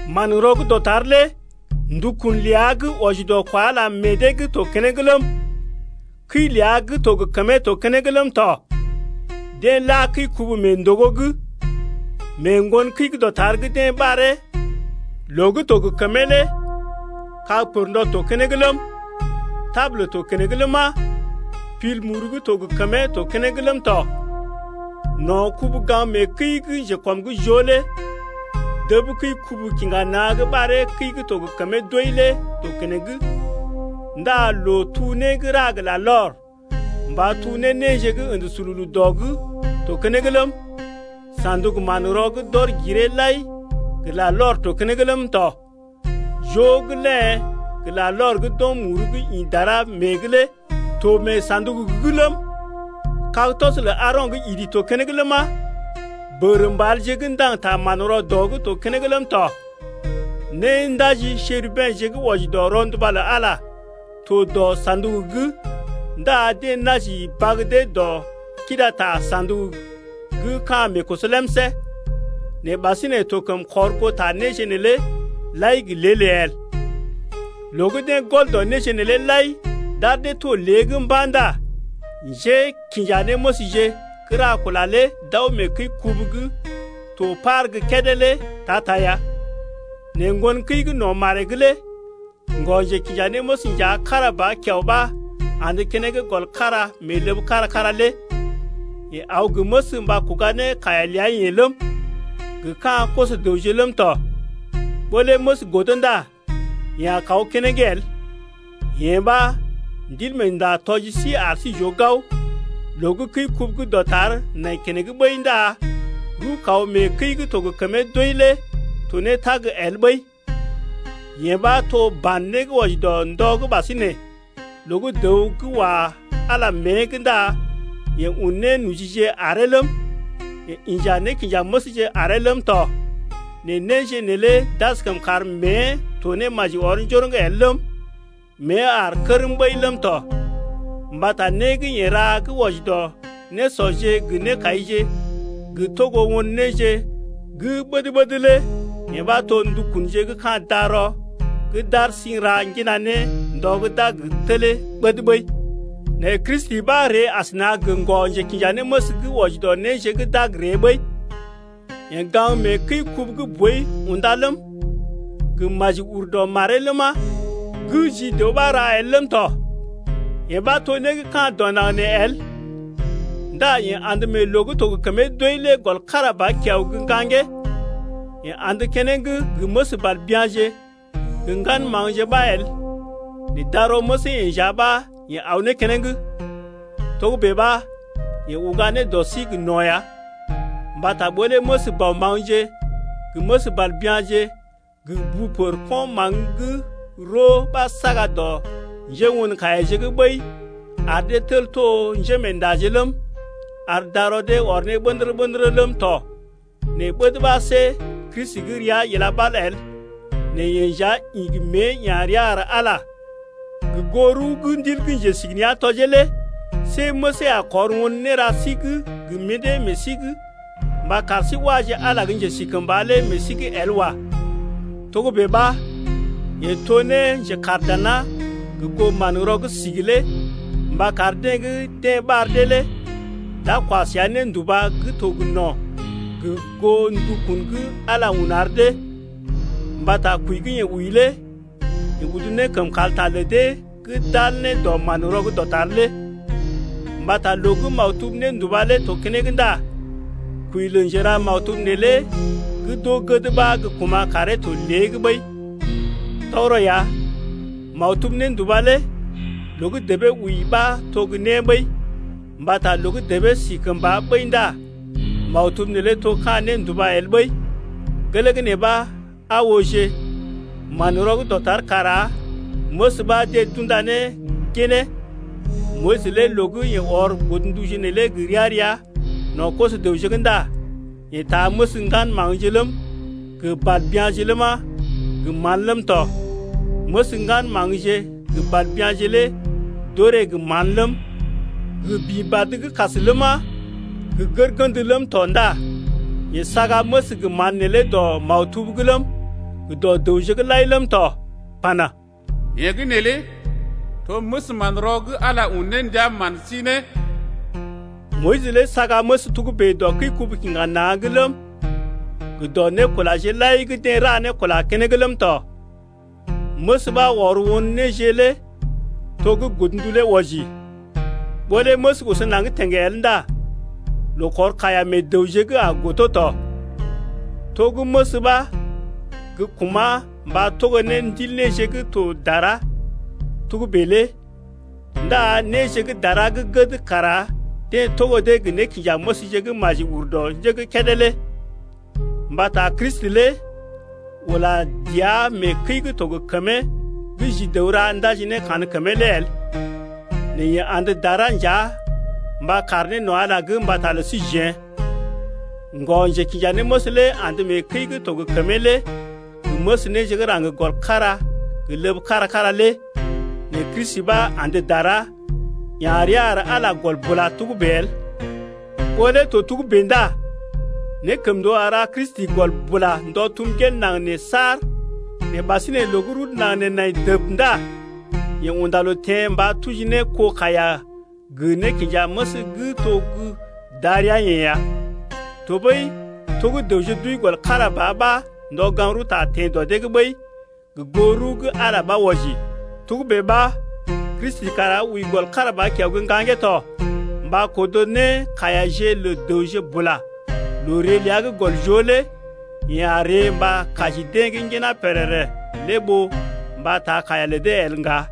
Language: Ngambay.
Manrɔ gə́ dɔtar lé ndukun ləa gə́ wɔji dɔ kwa Ala meḛ dee’g to keneŋ ləm, kəi ləa gə́ to gə kəmee to keneŋ ləm tɔ. Deḛ la kəi-kubu mee ndògo’g. Mee ŋgon kəi gə́ dɔtar gə́ deḛ ɓaree loo gə́ to gə kəmee lé kag pərndɔ to keneŋ ləm, tabul to keneŋ ləma, pil muru gə́ to gə kəmee to keneŋ ləm tɔ. No̰ kubu-gaŋg-mee-kəi gə́ njekɔm’g joo lé dəb kəi-kubu-kiŋga-na̰ gə́ ɓaree kəi gə́ to gə kəmee doi lé to keneŋ ndá loo-tuu-né gə́ ra gə larlɔr mba tuu ne néje gə́ ə̰də sululu dɔ’g to keneŋ ləm, sa̰duk-manrɔ gə́ d’ɔr giree lai gə larlɔr to keneŋ ləm tɔ. Jo gə́ léḛ gə larlɔr gə́ d’ɔm muru gə́ ḭ dara mée’g lé to mee sa̰duk’g ləm, kag-tɔs lə Aaro̰ gə́ idi to keneŋ ləma, bəgərə mbalje gə́ ndaŋg ta manrɔ dɔ’g to keneŋ ləm tɔ. Néndaji Nékundaje gə́ dara gə́ wɔji dɔ rɔnduba lə Ala to dɔ sa̰duk’g ndá deḛ naji bag dee dɔ kidata sa̰duk gə́ ka̰ meekoso lemsé’g lé. Nɛ ɓasinè to kəm kɔr goo ta néje neelé lai gə́ lée-lée el. Loo gə́ deḛ gɔl dɔ néje neelé lai d’ar dee to lée’g mba̰ ndá njékinjanéməsje gə́ ra kula lé d’aw mee kəi-kubu gə́ to par gə́ kédé lé ta-ta ya. Nɛ ŋgon kəi gə́ no̰ maree’g lé ŋgɔ-njekinjanéməs nja kára ba kiao ɓa andə keneŋ gɔl kára mee ləb kára-kára lé. Yeḛ aw gə məs mba kuga ne kaiya ləa-yeḛ ləm, gə ka̰ koso-dəwje ləm tɔ. Ɓó lé məs godo ndá yeḛ a kaw keneŋ el. Yee ɓa Ndilmeenda tɔji sí ar sí j’oo gao, loo gə́ kəi-kubu gə́ dɔtar nai keneŋ ɓəi ndá rəw-kaw mee kəi gə́ to gə kəmee doi lé to ne tag el ɓəi. Yee ɓa to ban né gə́ wɔji dɔ ndɔ gə́ ɓasinè loo gə́ dəw gə́ wa Ala mée’g ndá yeḛ un nénojije aree ləm, yeḛ inja nékinjanéməsje aree ləm tɔ nɛ néje neelé d’askəm kar mée to ne maji ɔr njoroŋ el ləm, mée aar kərm ɓəi ləm tɔ. Mbata né gə́ yeḛ ra gə́ wɔji dɔ nésɔje gə nékaije gə togo won néje gə́ ɓəd-ɓəd lé yee ɓa to ndukunje gə́ ka̰ darɔ gə́ d’ar sí n’ra ŋgina ne ndɔ gə́ d’a gə telee ɓəd ɓəi. Nɛ Kristi ɓa ree asəna gə ŋgɔ-njekinjanéməs gə́ wɔji dɔ néje gə́ d’a gə ree ɓəi. Yeḛ gaŋg mee kəi-kubu gə́ boi unda ləm, gə́ maji ur dɔ maree ləma, gə́ ji dəw ɓa ra el ləm tɔ yee ɓa to né gə́ ka̰ dɔ naŋg nee el. Ndá yeḛ andə mee loo gə́ to gə kəmee doi lé gɔl kára ba kiao gə́ ŋgaŋgee, yeḛ andə keneŋ gə məs bàl bya̰je gə ŋgan maŋgje ɓa el nɛ darɔ məsee-yeḛ nja ɓa yeḛ aw ne keneŋ. Togə́bè ɓa yeḛ uga ne dɔ sí gə no̰ ya. Mbata ɓó lé məs bɔ maŋgje gə məs bàl bya̰je gə bu pər ko̰ maŋg gə́ roo ɓa saga dɔ njéwon-kaiyaje’g ɓəi ar dee tel to njémeendaje ləm, ar darɔ dee ɔr ne ɓə̰dərə-ɓə̰dərə ləm tɔ 4nɛ ɓəd ɓa see Kristi gə́ rəa ila ɓal el nɛ yeḛ nja ḭ gə mée ya̰ rəa ar Ala gə goo rəw gə́ Ndil gə́ Njesigənea̰ tɔjee lé see məsee a kɔr won néra sí gə́ gə mḭdé meḛ sí’g mba kar sí waje Ala gə́ njesikəmba lé meḛ sí’g el wa. Togə́bè ɓa, yeḛ to ne njekaar dana gə goo manrɔ gə́ sigi lé mba kar deḛ gə́ deḛ ɓar dee lé d’a kwa səa nénduba gə́ to gə no̰ gə goo ndukun gə́ Ala un ar dee. Mbata kwəi gə́ yeḛ wəi lé yeḛ udu ne kəm kalta lə dee gə́ d’al ne dɔ manrɔ gə́ dɔtar lé. Mbata loo gə́ maktub nénduba lé to keneŋ ndá kwəi lə njera maktub neelé gə́ d’oo gəd ɓa gə́ kuma̰ karee to lée’g ɓəi. Tɔgərɔ ya, maktub nénduba lé loo gə́ debee wəi ɓa to gə́ né ɓəi mbata loo gə́ debee si kəmba ɓəi ndá maktub neelé to ka̰ nénduba el ɓəi. Gelee gə́ nee ɓa aa ooje manrɔ gə́ dɔtar kara məs ɓa deḛ d’unda ne ginee. Moyis lé loo gə yeḛ ɔr godnduje neelé gə ria-ria no̰ koso-dəwje’g ndá yeḛ taa məs ŋgan maŋgje ləm, gə bàl bya̰je ləma, gə mán ləm tɔ. Məs ŋgan maŋgje gə bàl bya̰je lé d’orè gə mán ləm, gə bḭ badə gə́ kas ləma, gə gərgənd ləm tɔ ndá yeḛ saga məs gə mán neelé dɔ maktub’g ləm, gə dɔ dəwje’g lai ləm tɔ pana: Yee gə́ neelé to məs manrɔ gə́ Ala un ne ndia man sí ne. Moyis lé saga məs togə́bè dɔ kəi-kubu-kiŋga-na̰’g ləm, gə dɔ nékulaje lai gə́ deḛ ra ne kula keneŋ ləm tɔ. Məs ɓa ɔr won néje lé to gə́ godndu lé wɔji, ɓó lé məs oso naŋg teŋ el ndá loo kɔr kaiya meḛ dəwje’g a godo tɔ. To gə́ məs ɓa gə́ kuma̰ mba togo ne ndil néje gə́ to dara togə́bè lé ndá néje gə́ dara gə́ gəd kara deḛ togo dee gə nékinjanéməsje gə́ maji ur dɔ njé gə́ kédé lé. Mbata Kristi lé ula dəa mee kəi gə́ to gə kəmee gə́ ji dəw ra ndaji ne kankəmee lé el. Nɛ yeḛ andə dara nja mba kaar ne no̰ Ala’g mbata lə síjeḛ. Ŋgɔ-njekinjanéməs lé andə mee kəi gə́ to gə kəmee lé gə məs néje gə́ raŋg gɔl kára gə ləb kára-kára lé nɛ Kristi ɓa andə dara, ya̰ rəa ar Ala gɔl bula togə́bè el. Ɓó lé to togə́bè ndá nékəmndoo a ra Kristi gɔl bula ndɔ tum gel naŋg nee saar, nɛ ɓasinè loo gə́ rudu naŋg nee nai dəb ndá yeḛ unda loo teḛ mba tuji ne kó kaiya gə nékinjaməs gə́ to gə́ darəa-yeḛ ya. Tɔɓəi to gə́ dəwje d’wəi gɔl kára ba ɓa ndɔ gaŋg-rəwta teḛ dɔ dee’g ɓəi gə goo rəw gə́ Ala ɓa wɔji, togə́bè ɓa Kristi kara wəi gɔl kára ba kiao gə́ ŋgaŋgee to mba kodo ne kaiyaje lə dəwje bula. Loo ree ləa gə́ gɔl joo lé yeḛ a ree mba kaji deḛ gə́ ŋginá pèrèrè lé ɓó mba taa kaiya le dee el ŋga.